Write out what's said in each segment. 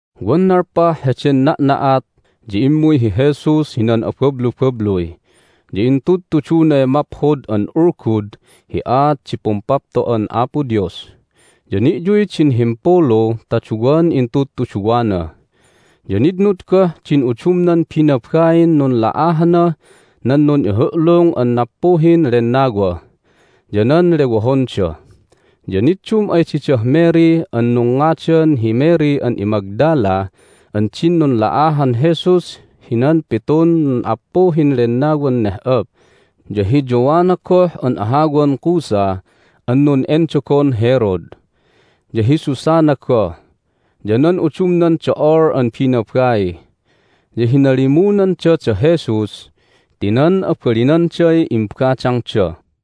Wan nalpah heden na'na'at ya immuy hi Jesus hinan abablubabluy, ya intudtudunay Maphod an Ulgud hi aat di Pumpapto'an Apo Dios. Ya ni'yuy din himpulu ta duwan intudtuduwana, ya nitnud goh din udumnan binabain nunla'ahanah nan nun'ihu'lung an nappuhin lennawa, ya nan lewohonda. Ya niddum ay didah Mary an nungngadan hi Mary an iMagdala an din nunla'ahan Jesus hinan pitun nun'appuhin lennawan neh'op, ya hi Joanna goh an ahawan Cuza an nun'endogon Herod, ya hi Susanna goh, ya nan udumnan do'ol an binabai. Ya hinalimunanda da Jesus ti nan abalinanday imbadangda.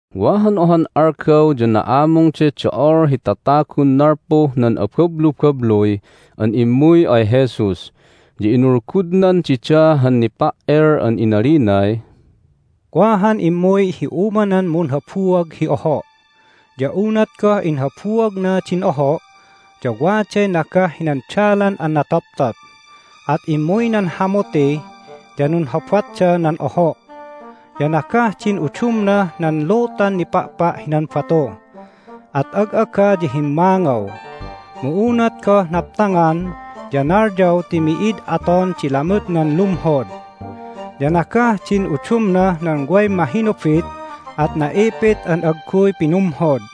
Wa han ohan algaw ya na'amungday do'ol hi tatagun nalpuh nan abablubabluy an immuy ay Jesus, ya inulgudnan dida han nipa"el. Hay Aat ten Nipa"el An inalinay, "Wa han immuy hi umanan munhabuag hi oho'. Ya unat goh inhabuagna din oho' ya waday nagah hinan dalan an natoptop, at immuy nan hamuti, ya nunhobatda nan oho'. Ya nagah din udumnah nan lutan nipa'pa' hinan batu, at ag'aga ya himmangaw. Mu unat goh naptangan ya nalyaw ti mi'id aton di lamutnan lumhod. Ya nagah din udumnah nan way mahinubit, at na'ipit an agguy pinumhod.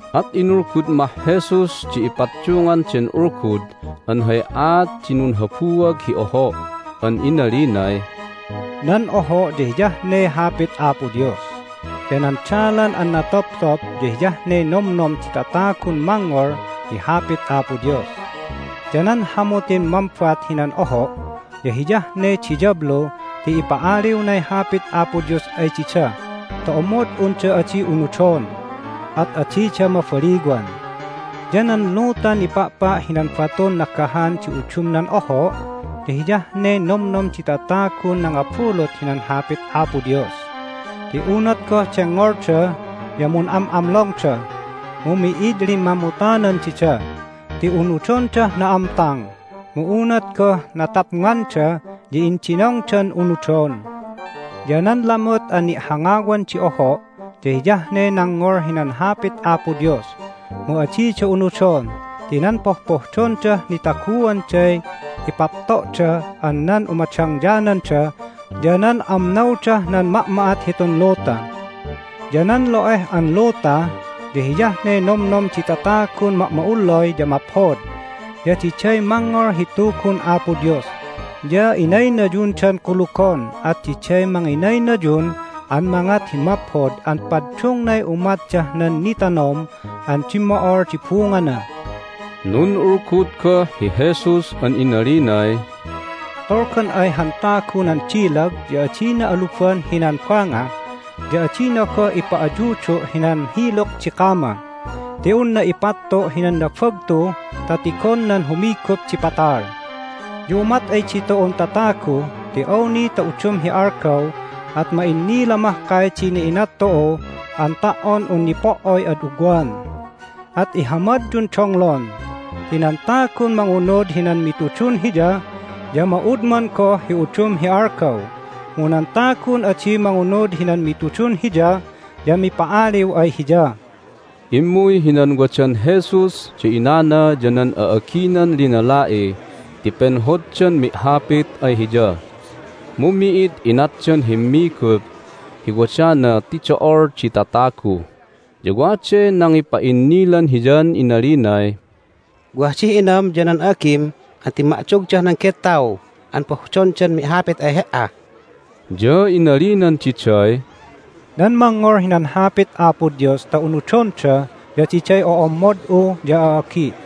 At inulgud mah Jesus di ipaddungan den ulgud an hay aat di nunhabuag hi oho' an inalinay, "Nan oho' ya hiyah ne Hapit Apo Dios. Ya nan dalan an natoptop ya hiyah ne nomnom di tatagun mangngol hi Hapit Apo Dios. Ya nan hamutin mambat hinan oho' ya hiyah ne diyablu ti ipa'aliwnay Hapit Apo Dios ay dida ta omod unda adi unudon, at adida mabaliwan. Ya nan lutan nipa'pa' hinan batun nagahan di udumnan oho' ya hiyah ne nomnom di tatagun nangabulut hinan Hapit Apo Dios. Ti unat goh dengngolda ya mun'am'amlongda, mu mi'id limmamutanan dida. Ti unudondah na'amtang, mu unat goh natapnganda ya indinongdan unudon. Ya nan lamut an ni'hangawan di oho' ya hiyah ne nangngol hinan Hapit Apo Dios, mu adida unudon ti nan pohpohdondah nitaguanday ipapto'da an nan umadangyananda, ya nan amnawdah nan ma'ma'at hitun luta. Ya nan lo'eh an luta ya hiyah ne nomnom di tatagun ma'ma'ullay ya maphod, ya diday mangngol hi Tugun Apo Dios, ya inaynayundan kulugon, at diday manginaynayun an mangat hi maphod an paddungnay umatdah nan nitanom an dimmo'ol di bungana." Nun'ulgud goh hi Jesus an inalinay, "Tolgan ay han tagu nan dilag ya adina aluban hinan banga, ya adina goh ipa'ayudu' hinan hiluk di kama. Ti unna ipattu' hinan nabagtu ta tigon nan humigup di patal. Ya umat ay ditu'un tatagu ti awni ta udum hi algaw at ma'innila mahkay di ina'inat tu'u an ta"on un nipo"oy ad ugwan. At ihamadyun donglon. Ti nan tagun mangunud hinan mitudun hiya ya ma'udman goh hi udum hi algaw, mu nan tagun adi mangunud hinan mitudun hiya ya mipa'aliw ay hiya." Immuy hinan wadan Jesus da inana ya nan a'aginan linala'i ti penhoddan mi'hapit ay Hiya, mu mi'id inatdan himmigup hi wadana ti do'ol di tatagu. Ya waday nangipa'innilan Hiyan inalinay, "Wah dih inam ya nan a'agim an timma'dogdah nan gettaw an pohdondan mi'hapit ay He"a." Ya inalinan diday, "Nan mangngol hinan Hapit Apo Dios ta unudonda ya diday o'ommod'u ya a'agi'."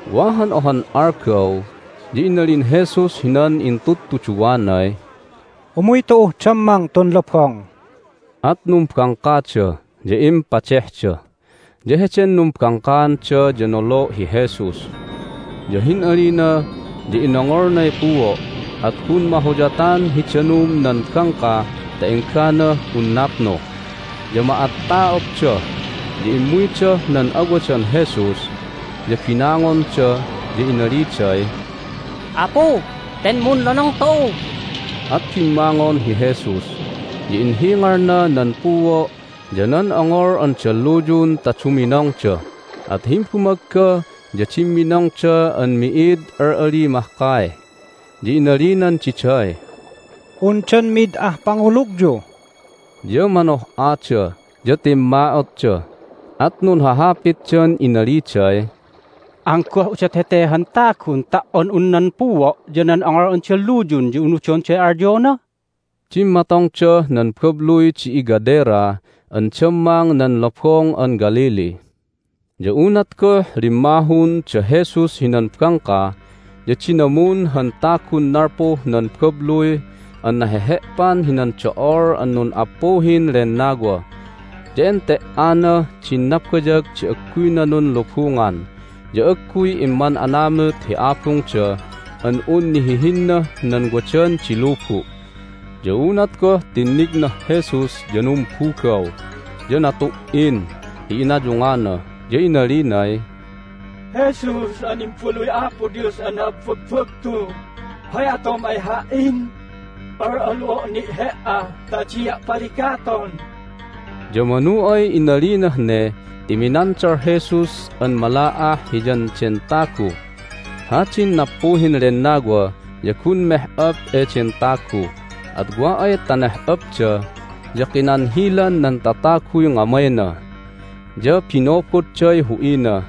Wa han ohan algaw ya inalin Jesus hinan intudtuduwanay, "Umuy tu'uh dammang tun lobong." At numbangkada, ya impadehda. Ya heden numbangkaanda ya nolo' hi Jesus. Ya hin'alina ya inongolnay puo', at gun mahuyatan hi danum nan bangka ta engganah un napnu, ya ma'atta'otda. Ya immuydah nan awadan Jesus, ya binangonda, ya inaliday, "Apu! Ten munlonong tu'u!" At bimmangon hi Jesus, ya inhingalna nan puo' ya nan ongol an dalluyun ta duminongda. At himbumagga ya dimminongda an mi'id al'ali mahkay. Ya inalinan diday, "Undan mi'id ah pangulugyu?" Ya manoh'ada, ya timma'otda, at nunhahapitdan inaliday, "Anggoh udot hete han tagun ta"on un nan puo' ya nan ongol an dalluyun ya unudonday alyona?" Dimmatongdah nan babluy di iGadera an dammang nan Lobong an Galilee. Ya unat goh limmahun da Jesus hinan bangka ya dinamun han tagun nalpuh nan babluy an nahehe'pan hinan do'ol an nun'appuhin lennawa. Ya ente"anah din nabayag di agguyna nunlubungan, ya agguy imman'anamut hi abungda an un nihihinnah nan wadan di lubu'. Ya unat goh tinnignah Jesus ya numbugaw, ya natu"in hi inayungana, ya inalinay, "Jesus an Imbaluy Apo Dios an na'abbagbagtu! Hay atom ay ha"in? Al'alu'o' ni' He"a ta adia' paligaton!" Ya manu ay inalinah ne ti minandal Jesus an mala'ah hiyan den tagu. Hadin nappuhin lennawa ya gun meh'op eden tagu, at wa ay ta neh'opda ya kinanhilan nan tataguy ngamayna, ya binobodday hu'ina,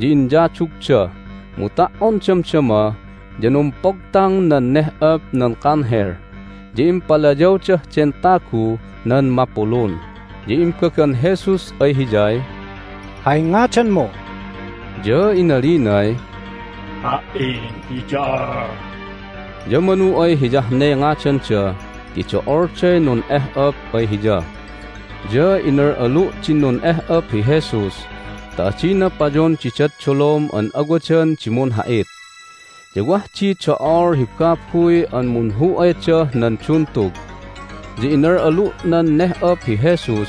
ya inyadugda, mu ta"on damdama ya numpogtang nan neh'op nan kanhel, ya impalayawdah den taguh nan mapulun. Ya imbagan Jesus ay hiyay, "Hay ngadanmu?" Ya inalinay, "Ha"in hi Do'ol." Ya manu ay hiyah ne ngadanda ti do'olday nun'eh'op ay hiya. Ya inal'alu' din nun'eh'op hi Jesus ta adina payon didad dolom an awadan di munha'it. Ya wah di do'ol hi babuy an munhu'aydah nan duntug. Ya inal'alu' nan neh'op hi Jesus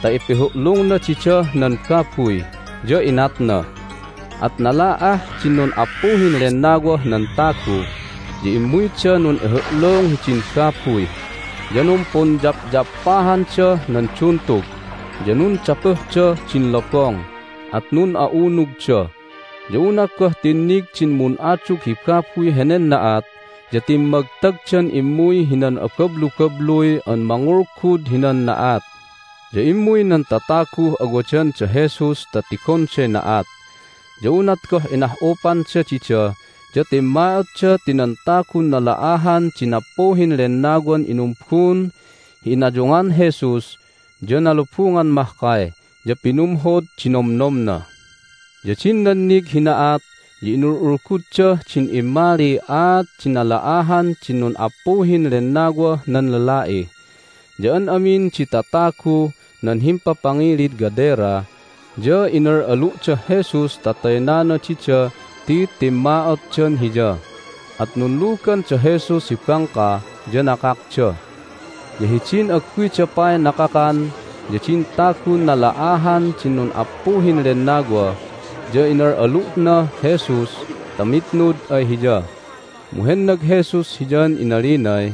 ta ipihu'lungna didah nan babuy, ya inatna. At nala'ah din nun'appuhin lennawah nan tagu, ya immuyda nun'ihu'lung hidin babuy, ya numpunyapyappahandah nan duntug, ya nundapuhdah din lobong, at nun'a'unugda. Ya unat goh tinnig din mun'adug hi babuy henen na'at ya timmagtagdan immuy hinan abablubabluy an mangulgud hinan na'at. Ya immuy nan tataguh awadan da Jesus ta tigonday na'at. Ya unat goh inah'upanda dida ya timma'otda ti nan tagun nala'ahan di nappuhin lennawan inumbun hi inayungan Jesus ya nalubungan mahkay, ya pinumhod di nomnomna. Ya din nannig hi na'at ya inul'ulguddah din immaliy aat di nala'ahan din nun'appuhin lennawah nan lala'i. Ya an amin di tataguh nan himpapangilid Gadera ya inal'alu'dah Jesus ta taynana dida ti timma'otdan Hiya. At nunlugan da Jesus hi bangka, ya nakakda. Ya hidin agguyda pay nakakan ya din tagun nala'ahan di nun'appuhin lennawa ya inal'alu'nah Jesus ta mitnud ay Hiya. Mu hennag Jesus hiyan inalinay,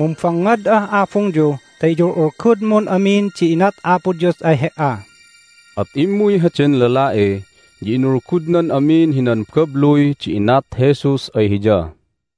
"Mumbangngad'ah abungyu ta iyul'ulgudmun amin di inat Apo Dios ay he"a." At immuy heden lala'i, ya inulgudnan amin hinan babluy di inat Jesus ay hiya.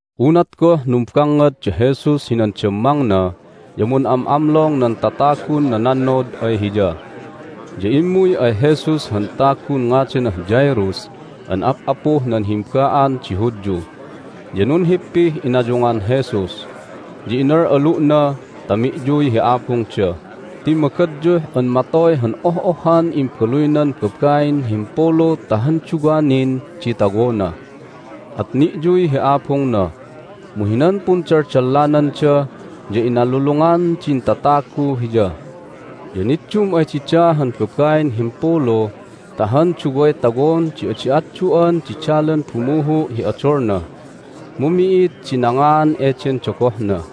Unat goh numbangngad da Jesus hinan dammangna ya mun'am'amlong nan tatagun nanannod ay Hiya. Ya immuy ay Jesus han tagun ngadanah Jairus an ap'apuh nan himba'an di Hudyu. Ya nunhippih inayungan Jesus, ya inal'alu'na ta mi'yuy hi abungda ti magadyuh an matoy han oh'ohhan imbaluynan babain himpulu ta han duwa nin di tawona. At ni'yuy hi abungna. Mu hinan pundaldallananda ya inalulungan din tatagu Hiya. Ya niddum ay dida han babain himpulu ta han duway tawon di adi atdu'an di dalan bumuhu' hi odolna, mu mi'id di nangaan eden dogohna.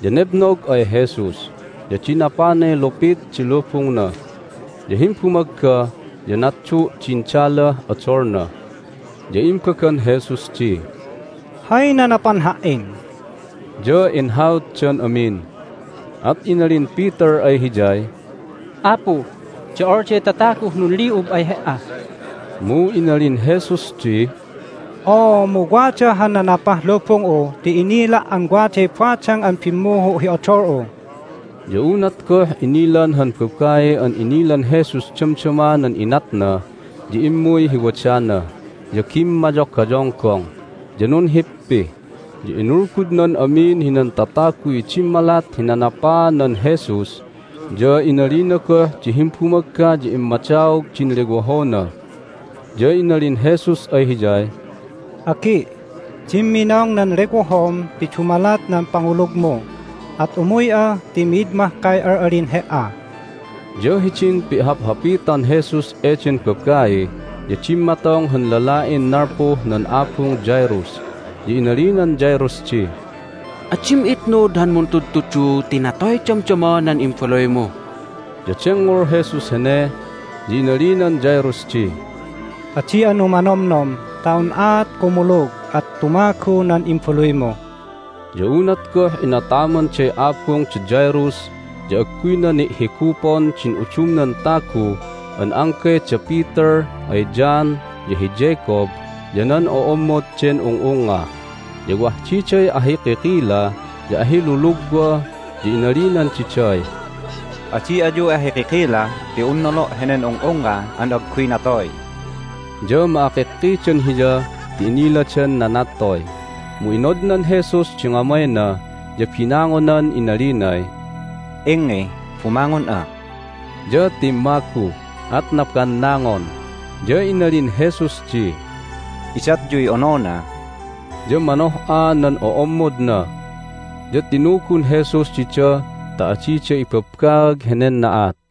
Ya nebnog ay Jesus, ya dinapanay lupit di lubungna. Ya himbumagga ya natdu' din dalah odolna. Ya imbagan Jesus di, "Hay nanapan Ha"in?" Ya inhautdan amin, at inalin Peter ay Hiyay, "Apu, do'olday tataguh nunli'ub ay He"a!" Mu inalin Jesus di, "Oo, mu wada han nanapah lubung'u ti inila' an waday badang an bimmuhu' hi odol'u." Ya unat goh inilan han babai an inilan Jesus damdama nan inatna ya immuy hi wadana, ya gimmayogayonggong, ya nunhippi, ya inulgudnan amin hinan tataguy dimmalat hi nanapaanan Jesus, ya inalina goh di himbumagga ya immadaog din lewohona. Ya inalin Jesus ay hiyay, "Agi', dimminong nan lewohom ti dumalat nan pangulugmu. At umuy'a ti mid mahkay al'alin he"a." Ya hidin pi'haphapitan Jesus eden babai ya dimmatong han lala'in nalpuh nan abung Jairus. Ya inalinan Jairus di, "Adim itnud han Muntudtudu ti natoy damdama nan imbaluymu." Ya dengngol Jesus hene, ya inalinan Jairus di, "Adi'a numanomnom ta un'aat kumulug at tumagu nan imbaluymu." Ya unat goh inatamanday abung da Jairus ya agguyna ni'higupon din udumnan tagu an anggay da Peter ay John, ya hi Jacob, ya nan o'ommod den ung'ungnga. Ya wah diday ahikikila ya ahilulugwa. Ya inalinan diday, "Adi ayu ahikikila ti un nolo' henen ung'ungnga an agguy natoy." Ya ma'akikkidan Hiya ti iniladan nanattoy. Mu inodnan Jesus di ngamayna, ya binangonan inalinay, "Ingngi, bumangon'a." Ya timmagu, at nabannangon, ya inalin Jesus di, "Idatyuy onona." Ya manoh'a nan o'ommodna. Ya tinugun Jesus dida ta adida ibabbaag henen na'at.